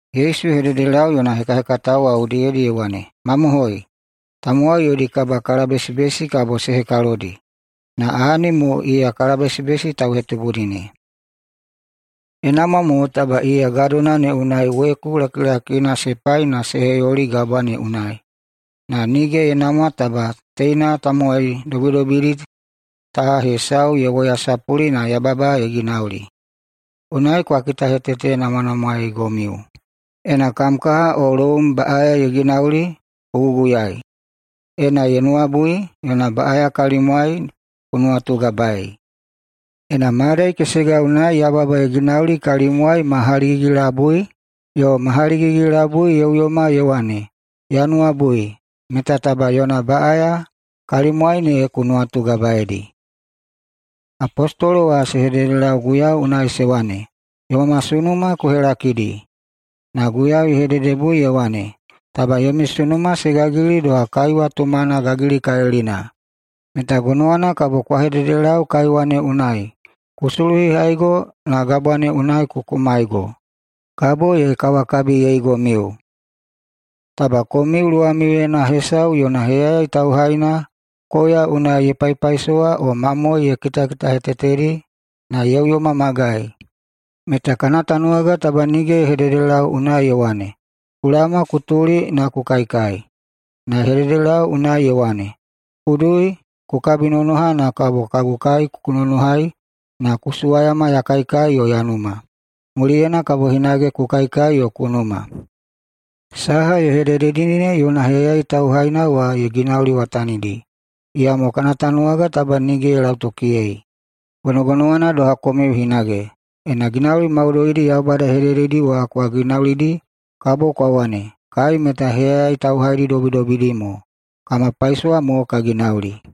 Yesu ye hededelau yona hekahekatao wa udiyedi ye wane, “Mamohoi, tamowai yodi kabakalabesibesi kabo se hekalodi, na ahani mo iya kalabesibesi tauhetubudi ne. Ye namwa mo taba iya gadona ne unai weku lakilakina se pai na se heyoli gabwa ne unai, na nige ye namwa taba teina tamowai dobidobidi ta hesau ye woyasapuli na yababa ye ginauli. Unai kwa kitahetetenamwanamwaeigomiu. Ena kam kaha o loum baꞌaya ye ginauli, ku guguyai. Ena ye nuwabui, yona baꞌaya kalimwai ku nuwatugabaei. Ena mayadai kesega unai yababa ye ginauli kalimwai ma haligigi-labui, yo ma haligigi-labui ye uyoma ye wane, ‘Ya nuwabui’, meta taba yona baꞌaya kalimwai ne ku nuwatugabaeidi.” Apostolo wa se hededelau Guiyau unai se wane, “Yoma sunuma ku helakidi.” Na Guiyau ye hededebui ye wane, “Taba yomi sunuma se gagili doha kaiwa tumana gagilikalilina meta gonowana kabo kwa hededelau kaiwa ne unai, ‘Ku suluhihaigo na gabwa ne unai ku kumaigo’, kabo ye kawakabiyeigomiu. Taba komiu luwamiuyena hesau yona heyayai tauhaina koya ye paipaisowai o mamoe ye kitakitahetetedi na ye uyoma magai, meta kana tanuwaga taba nige ye hededelau unai ye wane, ‘Ku laoma ku tuli na ku kaikai!’ Na ye hededelau unai ye wane, ‘Ku dui ku kabinonoha na kabo kagu kai ku nonohai na ku suwayama ya kaikai yo ya numa. Muliyena kabo hinage ku kaikai yo ku numa.’ Saha ye hedededi ne yona heyayai tauhaina wa ye ginauliwatanidi, iyamo kana tanuwaga taba nige ye lautokiyei. Gonogonowana doha komiu hinage, ena ginauli maudoidi Yaubada ye hedededi wa kwa ginaulidi, kabo kwa wane, ‘Kai meta heyayai tauhaidi dobidobidi mo, na kama paisowa mo ka ginaulidi.’”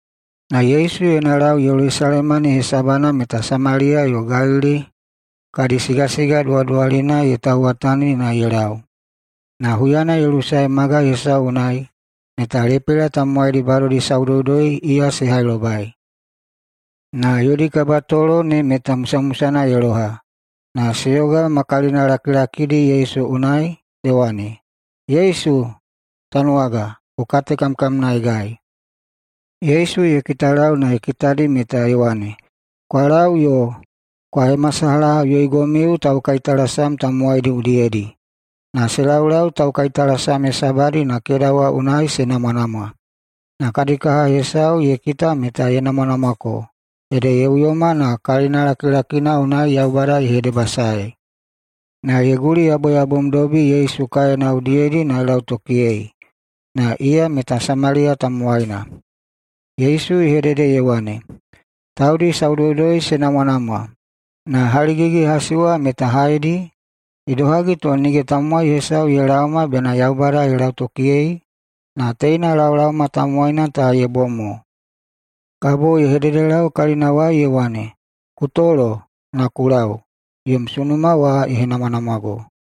Na Yesu yona lau Yelusalema ne hesabana meta Samaliya yo Galili kadi sigasiga duwaduwalina ye tauwatani na ye lau. Na huyana ye lusae magai hesau unai, meta lepela tamowaidi badodi saudoudoi iya se hailobai. Na yodi kabatolo ne meta musamusana ye loha na se yoga ma kalinalakilakidi Yesu unai se wane, “Yesu, Tanuwaga, ku katekamkamnaegai!” Yesu ye kitalau na ye kitadi meta ye wane, “Kwa lau yo kwa hemasalahaꞌuyoigomiu taukaitalasam tamowaidi udiyedi.” Na se laulau taukaitalasam hesabadi na keda wa unai se namwanamwa. Na kadi kaha hesau ye kita meta ye namwanamwako, ede ye uyo na kalinalakilaki unai Yaubada ye hedebasaei. Na ye guliyaboyabomdobi Yesu kaena udiyedi na ye lautokiyei. Na iya meta Samaliya tamowaina. Yesu ye hedede ye wane, “Taudi saudoudoi se namwanamwa. Na haligigi-hasi wa meta haedi? Idohagi to nige tamowai hesau ye laoma bena Yaubada ye lautokiyei, na teina laolaoma tamowaina ta ye bom mo?” Kabo ye hededelau kalinawai ye wane, “Ku tolo na ku lau, yom sunuma wa ye henamwanamwago.”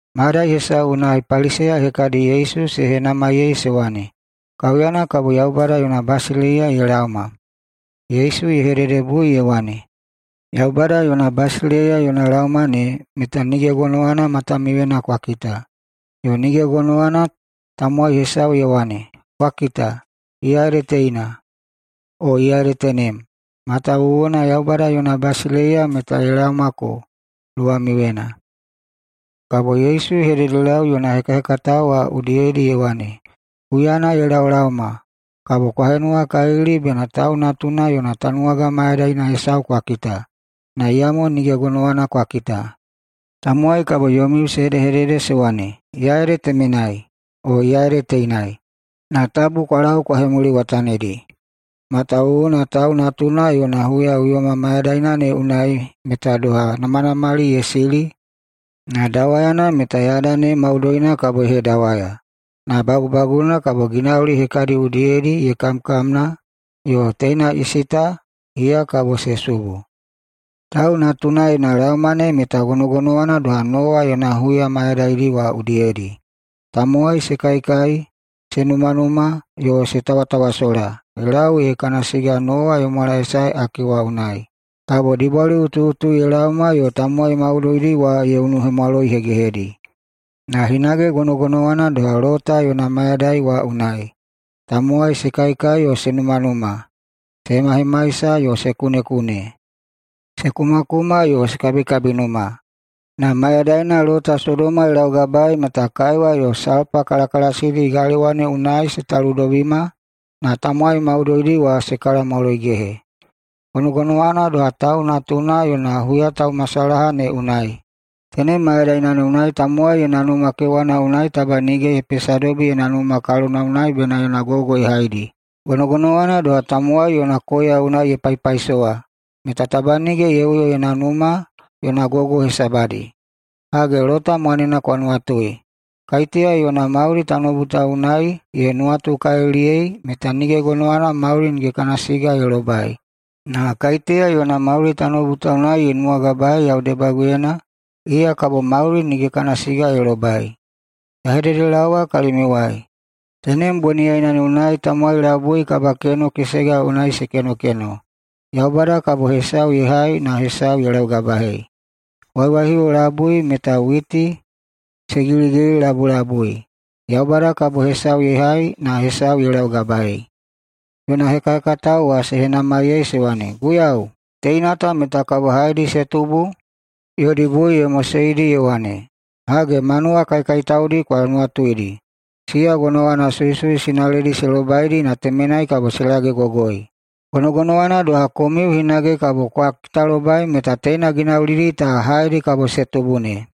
Mayadai hesau unai Paliseya hekadi Yesu se henamaiyei se wane, “Kaiuyana kabo Yaubada yona basileiya ye laoma?” Yesu ye hededebui ye wane, “Yaubada yona basileiya yona laoma ne meta nige gonowana matamiuyena kwa kita, yo nige gonowana tamowai hesau ye wane, ‘Kwa kita, iya ede teina,’ o ‘Iya ede tenem!’ Matawuwuna Yaubada yona basileiya meta ye laomako luwamiuyena.” Kabo Yesu ye hededelau yona hekahekatao wa udiyedi ye wane, “Huyana ye laolaoma kabo kwa henuwakalili bena Tau Natuna yona tanuwaga mayadaina hesau kwa kita, na iyamo nige gonowana kwa kita. Tamowai kabo yomiu se hedehedede se wane, ‘Iya ede temenai!’ o ‘Iya ede teinai!’ Na tabu kwa lau kwa hemuliwatanidi. Matawuwuna Tau Natuna yona huyaꞌuyoma mayadaina ne unai meta doha namanamali ye sili na dawayana meta yada ne maudoina kabo ye hedawaya. Na bagubaguna kabo ginauli hekadi udiyedi ye kamkamna yo teina isi ta iya kabo se subu. Tau Natuna yona laoma ne meta gonogonowana doha Nowa yona huya mayadaidi wa udiyedi. Tamowai se kaikai, se numanuma yo se tawatawasola ye lau ee kana siga Nowa ye mwalaesae ake wa unai. Kabo dibwaliꞌutuꞌutu ye laoma yo tamowai maudoidi wa ye unuhemwaloihegehedi. Na hinage gonogonowana doha Lota yona mayadai wa unai. Tamowai se kaikai yo se numanuma, se hemahemaisa yo se kunekune, se kumakuma yo se kabikabinuma. Na mayadaina Lota Sodoma ye laugabaei meta kaiwa yo salpa kalakalasidi galewa ne unai se taludobima na tamowai maudoidi wa se kalamwaloigehe. Gonogonowana doha Tau Natuna yona huyataumasalaha ne unai. Tenem mayadaina ne unai tamowai yona numa kewana unai taba nige ye pesadobi yona numa kalonawai bena yona gogo ye haidi. Gonogonowana doha, tamowai yona koya unai ye paipaisowa meta taba nige ye uyo yona numa, yona gogo hesabadi. Hage, Lota mwanena kwa nuwatui! Kaiteya yona mauli [tanoubu ta unai] ye nuwatukaliliyei meta nige gonowana mauli [nige kana siga] ye lobai. Na kaiteya yona mauli [tanoubu ta unai] ye nuwagabaei yau debaguyena, iya kabo mauli [nige kana siga] ye lobai. Ya hededelaowa kalimiuwai: Tenem boniyaina ne unai tamowai labui kabakeno kesega unai se kenokeno. Yaubada kabo hesau ye hai na hesau ye laugabaei. Waiwaihiuwo labui meta witi se giligililabulabui. Yaubada kabo hesau ye hai na hesau ye laugabaei.” Yona hekahekatao wa se henamaiyei se wane, “Guiyau, teina ta meta kabo haedi se tubu?” Yodi bui ye moseidi ye wane, “Hage, manuwa kaikaitaudi kwa nuwatuidi. Siya gonowana suisui sinaledi se lobaidi na temenai kabo se lagegogoi. [Gonogonowana doha, komiu hinage kabo kwa kitalobai meta teina ginaulidi ta haedi se tubu ne.]”